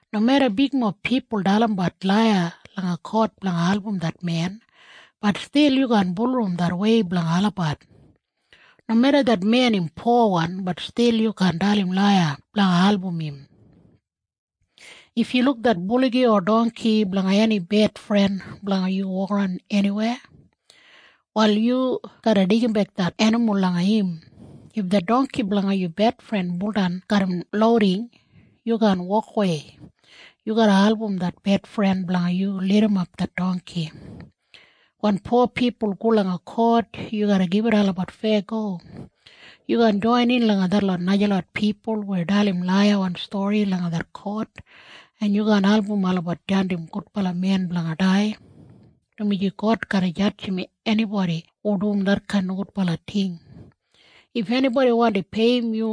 Nomeda bigmob pipul dalimbat laiya langa kot blanga album det men, bat stil yu kaan bulurrum det wei blanga olabat. Nomeda det men im powan, bat stil yu kaan dalim laiya blanga album im. If yu luk det buligi o dongki blanga eni bedfren blanga yu wokaran eniwei, wal yu garra deigimbek det enimul langa im. If det dongki blanga yu bedfren buldan garram louding, yu kaan wokawei. Yu garra album det bedfren blanga yu lidimap det dongki. Wen po pipul go langa kot, yu garra gibit olabat feyago. Yu kaan joinin langa detlot najalot pipul weya dalim laiyawan stori langa det kot, en yu kaan album olabat jandim gudbala men blanga dai, dumaji God garra jadjim enibodi hu dum detkain nogudbala ting. If enibodi wandi peiyim yu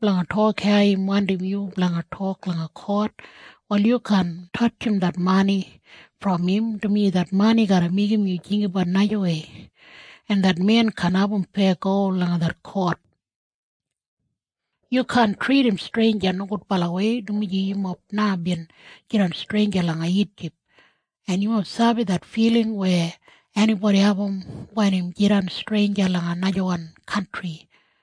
blanga tok hau im wandim yu blanga tok langa kot, wal yu kaan tatjim det mani brom im, dumaji det mani garra meigim yu jinggabat najawei, en det men kaan abum feyago langa det kot. Yu kaan tridim streinja nogudbalawei, dumaji yumob na bin jidan streinja langa Ijip, en yumob sabi det filing weya enibodi abum wen im jidan streinja langa najawan kantri.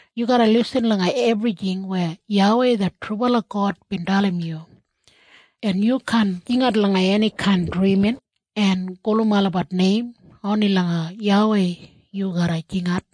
Yu garra lisin langa ebrijing weya YAWEI det trubala God bin dalim yu, en yu kaan jingat langa enikain drimin en gulum olabat neim. Oni langa YAWEI yu garra jingat.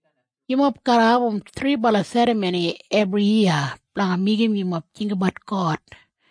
Yumob garra abum thribala serramoni ebriyiya blanga meigim yumob jinggabat God.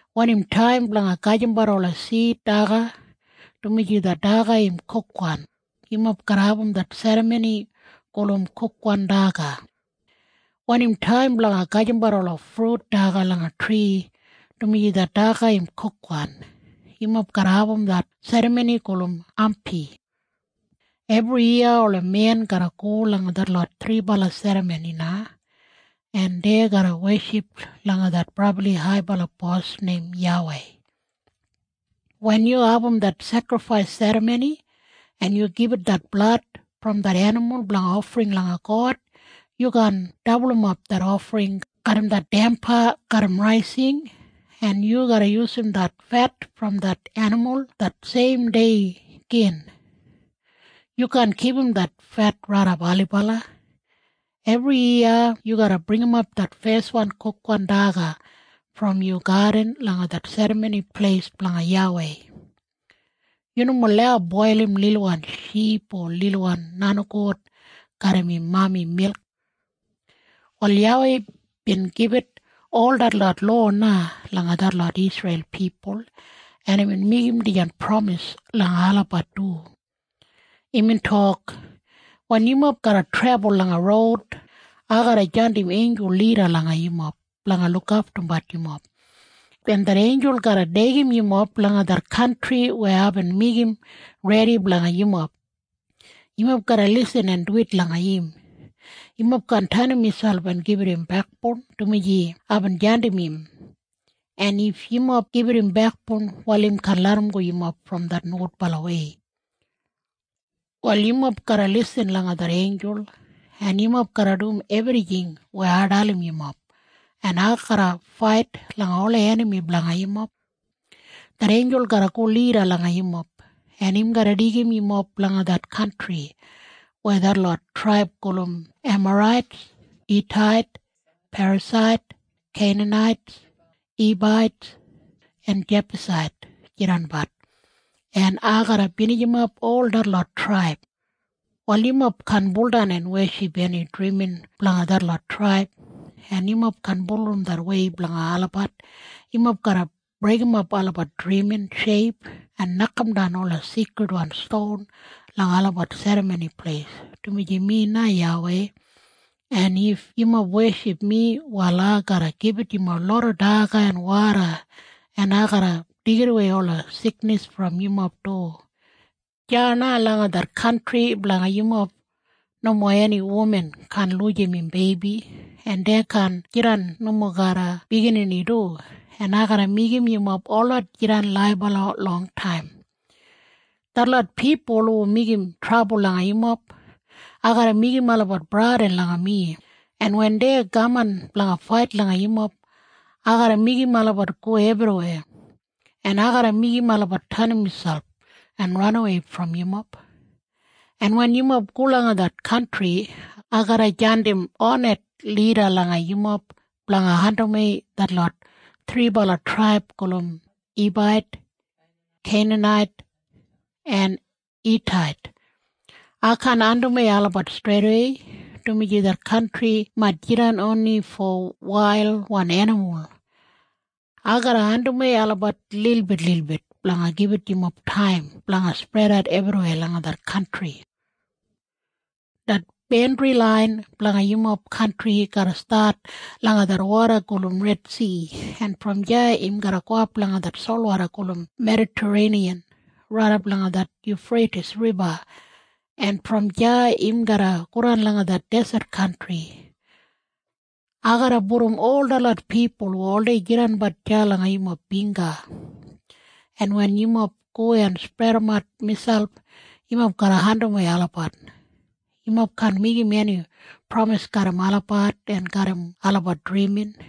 Wen im taim blanga gajimbat ola sid daga dumaji det daga im kukwan, yumob garra abum det serramoni gulum Kukwan Daga. Wen im taim blanga gajimbat ola frut daga langa tri dumaji det daga im kukwan, yumob garra abum det serramoni gulum Hampi. Ebriyiya ola men garra go langa detlot thribala serramoni na, en dei garra weship langa det brabli haibala bos neim YAWEI. Wen yu abum det sekrifais serramoni, en yu gibit det blad brom det enimul blanga ofring langa God, yu kaan dabulumap det ofring garram det damba garram raising, en yu garra yusum det fet brom det enimul det seim dei gin. Yu kaan kipum det fet raidap ailibala. Ebriyiya yu garra bringimap det feswan kukwan daga brom yu gadin langa det Serramoni Pleis blanga YAWEI. Yu nomo lau boilim lilwan ship o lilwan nenigout garram im mami milk. Wal YAWEI bin gibit ol detlot lowa na langa detlot Isreil pipul, en imbin meigim dijan pramis langa olabat du. Imbin tok, “Wen yumob garra trebul langa roud, ai garra jandim einjul lida langa yumob blanga lukaftumbat yumob, en det einjul garra deigim yumob langa det kantri weya aibin meigim redi blanga yumob. Yumob garra lisin en duwit langa im. Yumob kaan tenim miselp en gibit im bekboun, dumaji aibin jandim im. En if yumob gibit im bekboun, wal im kaan larramgo yumob brom det nogudbalawei. “Wal yumob garra lisin langa det einjul, en yumob garra dum ebrijing weya ai dalim yumob, en ai garra fait langa ola enami blanga yumob. Det einjul garra go lida langa yumob, en im garra deigim yumob langa det kantri weya detlot traib gulum Emarait, Hitait, Perasait, Keinanait, Hibait en Jebusait jidanbat, en ai garra binijimap ol detlot traib. “Wal yumob kaan baudan en weship eni drimin blanga detlot traib, en yumob kaan bulurrum det wei blanga olabat. Yumob garra breigimap olabat drimin sheip en nokamdan ola seikridwan ston langa olabat serramoni pleis, dumaji mi na YAWEI, en if yumob weship mi, wal ai garra gibit yumob loda daga en woda, en ai garra deigidawei ola siknis brom yumob du. Deya na langa det kantri blanga yumob nomo eni wuman kaan lujim im beibi, en dei kaan jidan nomo garra biginini du, en ai garra meigim yumob holot jidan laibala longtaim. “Detlot pipul hu meigim trabul langa yumob, ai garra meigim olabat bradin langa mi, en wen dei kaman blanga fait langa yumob, ai garra meigim olabat go ebriweya, en ai garra meigim olabat tenim miselp en ranawei brom yumob. En wen yumob go langa det kantri, ai garra jandim honet lida langa yumob blanga andimwei detlot thribala traib gulum Hibait, Keinanait en Hitait. Ai kaan andimwei olabat streidawei, dumaji det kantri mait jidan oni fo wailwan enimul. Ai garra andimwei olabat lilbitlilbit blanga gibit yumob taim blanga spredat ebriweya langa det kantri. “Det bandri lain blanga yumob kantri garra stat langa det woda gulum Redsi, en brom deya im garra gowap langa det solwoda gulum Medatareiniyan raidap langa det Yufreitis Riba, en brom deya im garra godan langa det deset kantri. Ai garra pudum ol detlot pipul hu oldei jidanbat deya langa yumob bingga, en wen yumob go en spredimat miselp, yumob garra andimwei olabat. Yumob kaan meigim eni pramis garram olabat en garram olabat drimin,